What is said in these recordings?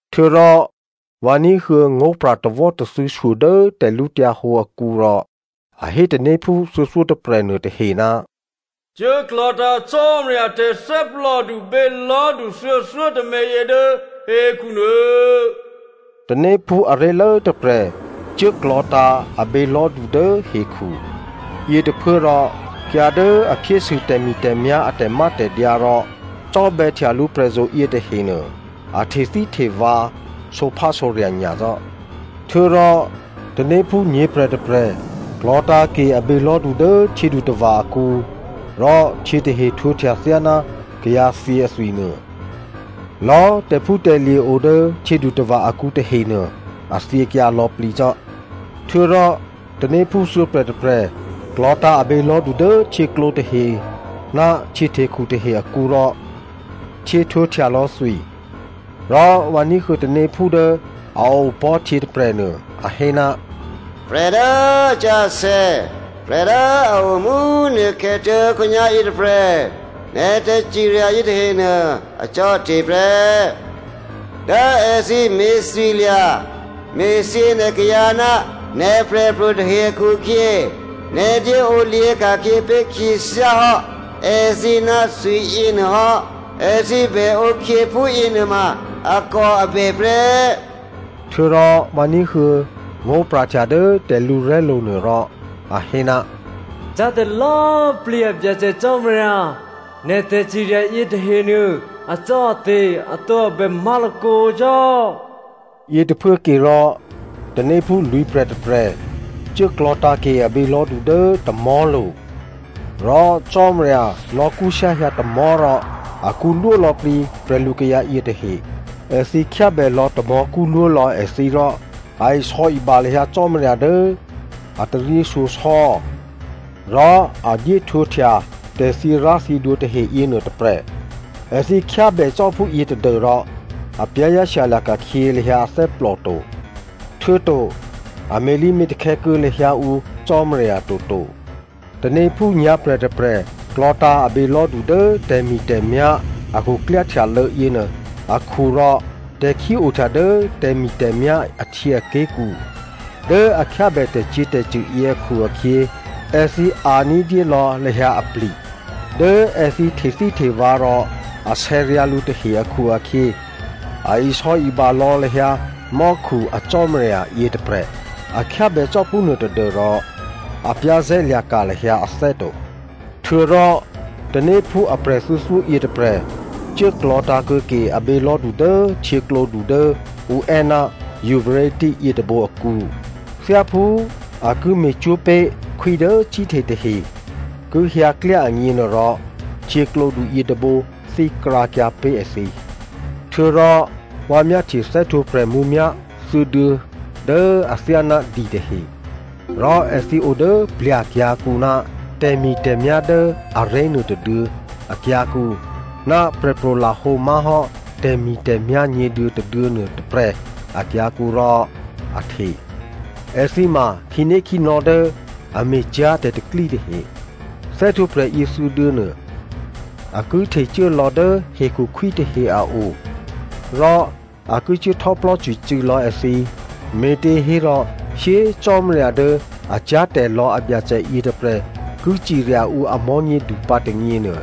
Htuô̌rò vǎ ní̤huô̌ ngó̤pra̤ tawò́tathû̌ shyo dố tè̤lǔhǒdu akǔ rò a hé tanéphú thuô̌thyótôprè̤ nuôtahe, “Cuố klò̤̌tǎ̤ Cò́marya a tè̤thè́plòdu bělò̤́du thuô̌thyótômě yě dố hekhunuô.” Tanéphú aré̤lố tôprè̤ cuố klò̤̌tǎ̤ a bělò̤́du dố hekhu. Yětôphuốrò kayǎ dố a phyésû tè̤mi̤tè̤myá̤ a tè̤mátè̤dyǎ rò cò́bè̌htya lǔprè̤zo̤ yětahenuô, a htethíhtevǎ sǒphásǒrya̤ nyacò́. Htuô̌rò tanéphú nyě̤prè̤ tôprè̤ klò̤̌tǎ̤ ke a bělò̤́du dố htyědutava̤ akǔ rò htyě tahe htwǒhtya thyáná kayǎthyě athwi nuô. Lò̌꤮ tè̤phútè̤lye̤ o dố htyědutava̤ akǔ tahenuô a thyěkyǎ lò̌plǐcò́. Htuô̌rò tanéphú thuô̌prè̤tôprè̤ klò̤̌tǎ̤ a bělò̤́du dố htyěklǒ tahe ná htyěhtekhu tahe akǔ rò htyě htwǒhtyalò̌ thwi. Rò vǎ ní̤huô̌ tanéphú dố a opò̤́ htyě tôprè̤nuô a hé, “Prè̤ dố asǎsè̌, prè̤ dố a o mú꤮ nukhè̌ tuố̤khǒnyá̤ yětôprè̤, nè̤ tè̤cirya yětahenuô, acò́ate̤ prè́. Dố èthǐ me̤thwilya̤ me̤thyě nè̤ kayǎ ná nè̤ prè̤pro̤ tahe akhu-akhyě nè̤ dyéǒ lyě̤ ka̤khyě pé̤ khyěthyá hò́ èthǐ ná thwi yěnuô hò́. Èthǐ bèǒkhyě phúyě nuôma akòabè prè́.” Htuô̌rò vǎ ní̤huô̌ ngó̤pra̤htya dố tè̤lǔrè̤́lo̤ nuôrò a hé, “Cyá̤tè̤lò̌꤮ plǐ a Byacè Cò́marya, nè̤ tè̤cirya yětahenuô acò́ate̤, atǒabè má̤lakǒ cò́.” Yětôphuố ke rò tanéphú lwǐ̤prè̤ tôprè̤ cuố klò̤̌tǎ̤ ke a bělò̤́du dố tamò̤́lo̤ rò Cò́marya nò̌kṳ́shyáhyǎ tamò̤́ rò akṳ́lwó lò̌plǐ prè̤lukayǎ yětahe. Èthǐ khyábèlò̌ tamò̤́ kṳ́lwólò̌ èthǐ rò a isò̌iba lahyǎ Cò́marya dố a taryěshyosò̌ rò a dyéhtwǒhtya tè̤thyěrá̤thyědwǒ tahe yěnuô tôprè̤. Èthǐ khyábè cò́ phúyě tadû́rò a za̤ ní̤dû lahyǎ ané̤ to. Htuô̌to a me̤lǐme̤takhè̌ kuô̌ lahyǎ ǔ Cò́marya toto. Tanéphú nyǎ̤prè̤ tôprè̤ klò̤̌tǎ̤ a bělò̤́du dố tè̤mi̤tè̤myá̤ a khuklyáhtyalô̌ yěnuô akhu rò tè̤khí ohtya dố tè̤mi̤tè̤myá̤ ahtyěaké̤ kǔ. Dố a khyábè tè̤cyě̤tè̤cṳ̂ yě akhu-akhyě, èthǐ a̤ ní̤dyé lò̌ lahyǎ apli̤. Dố èthǐ htethíhtevǎ rò asè̌ ryǎ̤ lǔ tahe akhu-akhyě, a isò̌iba lò̌ lahyǎ mò́khu a Cò́marya yětôprè̤. A khyábè cò́ phúnuô tadû́rò a za̤ ní̤ lahyǎ ané̤ to. Htuô̌rò tanéphú aprè̤ thuô̌thyó yětôprè̤ cuố klò̤̌tǎ̤ kuô̌ke abělò̤́du dố htyěklǒdu dố ǔ è́ ná Euphrate yětôbǒ akǔ. Thyáphú a ki me̤cwó̤ pé̤ khwí dố cíhte tahe ki hyǎ klyá agněnuôrò, htyěklǒdu yětôbǒ thíkrǎkyǎ pé̤ èthǐ. Htuô̌rò vǎ myáhtye thè́htwǒprè̤ mǔmyá̤ thuô̌duô̌ dố athyáná di tahe. Rò èthǐ o dố plya̤ kyǎ̤kǔ ná tè̤mi̤tè̤myá̤ dố aré̤ nuôtôduô̌ akyǎ̤kǔ ná prè̤pro̤ lahǒ má̤hò́ tè̤mi̤tè̤myá̤ nyě̤duô̌ tôduô̌ nuôtôprè̤ akyǎ̤kǔ rò a hte. Èthǐ ma khǐnékhǐnò̌ dố a me̤cyá̤ tè̤pro̤tè̤prya̤ tahe. Thè́htwǒprè̤ yěthuô̌duô̌ nuô a ki htecuố lò̌ dố hekhu khwí tahe a o, rò a ki cuố htò́plò́cwicû̌ lò̌ èthǐ, me̤těhérò shyé꤮ Cò́marya dố a cyá̤tè̤lò̌ a Byacè yětôprè̤ ki cirya ǔ a mò̤́nyědu pǎ tônyěnuô,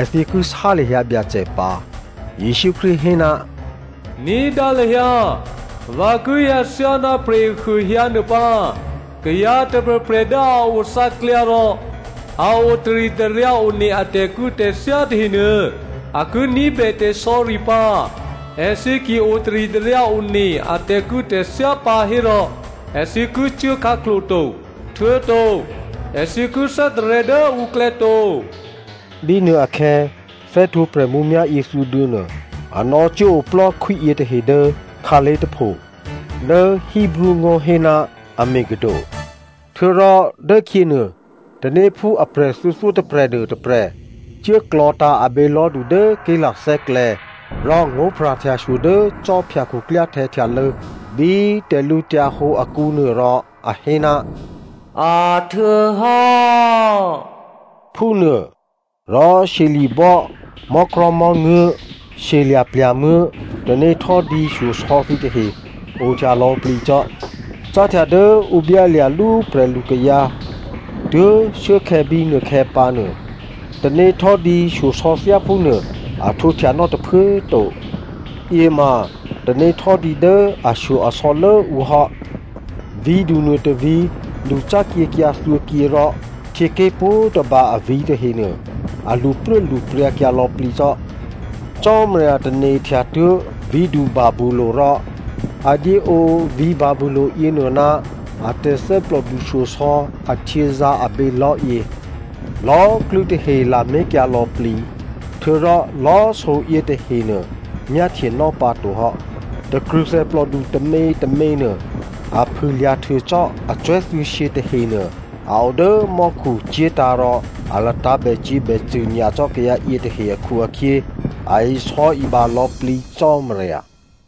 èthǐ ki sá lahyǎ Byacè pǎ. Jesǔ Krístu hé, “Ní̤dǎ lahyǎ, vǎ ki hyǎ thyáná prè̤ehuô hyǎ nuô pǎ. Kayǎ tôprè̤prè̤ dố a o thǎklyǎ rò a o taritaryǎ one a tè̤kû̌tè̤thyá tahenuô, a ki ní̤bè tè̤sò̌ri pǎ. Èthǐ ki otaritaryǎ one a tè̤kû̌tè̤thyá pǎ hérò, èthǐ ki cuố khǎklo̤ to, htuô̌to èthǐ ki thè́tarè̤̌ dố ǔklè̌ to.” Bínuôakhè̌ thè́htwǒprè̤ mǔmyá̤ yěthuô̌duô̌ nuô, a nò̌cuố oplò́ khwí yětahe dố khǎlé̤ tôpho dố Hebreo ngó̤ hé ná Armageddon. Htuô̌rò dốkhyěnuô tanéphú aprè̤ thuô̌thyótôprè̤ nuôtôprè̤ cuố klò̤̌tǎ̤ abělò̤́du dố ké̤lathè́klè̌ rò ngó̤pra̤htyashyo dố khwí khuklyáhtè̌ htyalô̌ bí tè̤lǔhǒdu akǔnuô rò a hé, “A htuô̌hò́,” phúnuô. Rò shyeli̤bò́, mò́krò̤̌mò́nguố̤, shyelya̤plya̤muố̤, tanéhtò́dǐ shyosò̌ thǐtahe ohtya lò̌plǐ cò́. Cáhtya dố ǔ byálya̤lú prè̤lukayǎ tuố̤ shuốkhè̌ bínuôkhè̌ pǎnuô, tanéhtò́dǐ shyosò̌ thyáphúnuô a htwǒhtya nò̌ tôphuố꤮ to. Yě ma tanéhtò́dǐ dố ashyo-asò̌ lố ǔ hò́. Vǐ̤du nuô tôvǐ̤ lṳcákyěkyǎ thuô̌kyě rò htyěké̤ pwǒ̤tôba avǐ̤ tahenuô, a lṳpruốlṳpryǎkyǎ lò̌plǐ cò́. Cò́marya tane̤htya tuố̤ vǐ̤du Babylonia rò a dyé ǒ vǐ̤ Babylonia yěnuô ná a tè̤thè́plòdu shyosò̌ ahtyězǎ̤ a bělò̤́yě. Lò̌꤮ klû́tahe lamé̤kyǎ lò̌plǐ, htuô̌rò lò̌꤮ so yětahenuô, myáhtyenò́ pǎtohò́. Takrṳ̂thè plòdu tômětômě nuô a phû꤮ lya̤ htuô cò́ acwè̤́ thuô̌shyě tahenuô a o dố mò́khu cye̤tǎ̤ rò a latǎ̤ bècyě̤bècṳ̂ nyacò́ kayǎ yětahe akhu-akhyě a isò̌iba lò̌plǐ Cò́marya.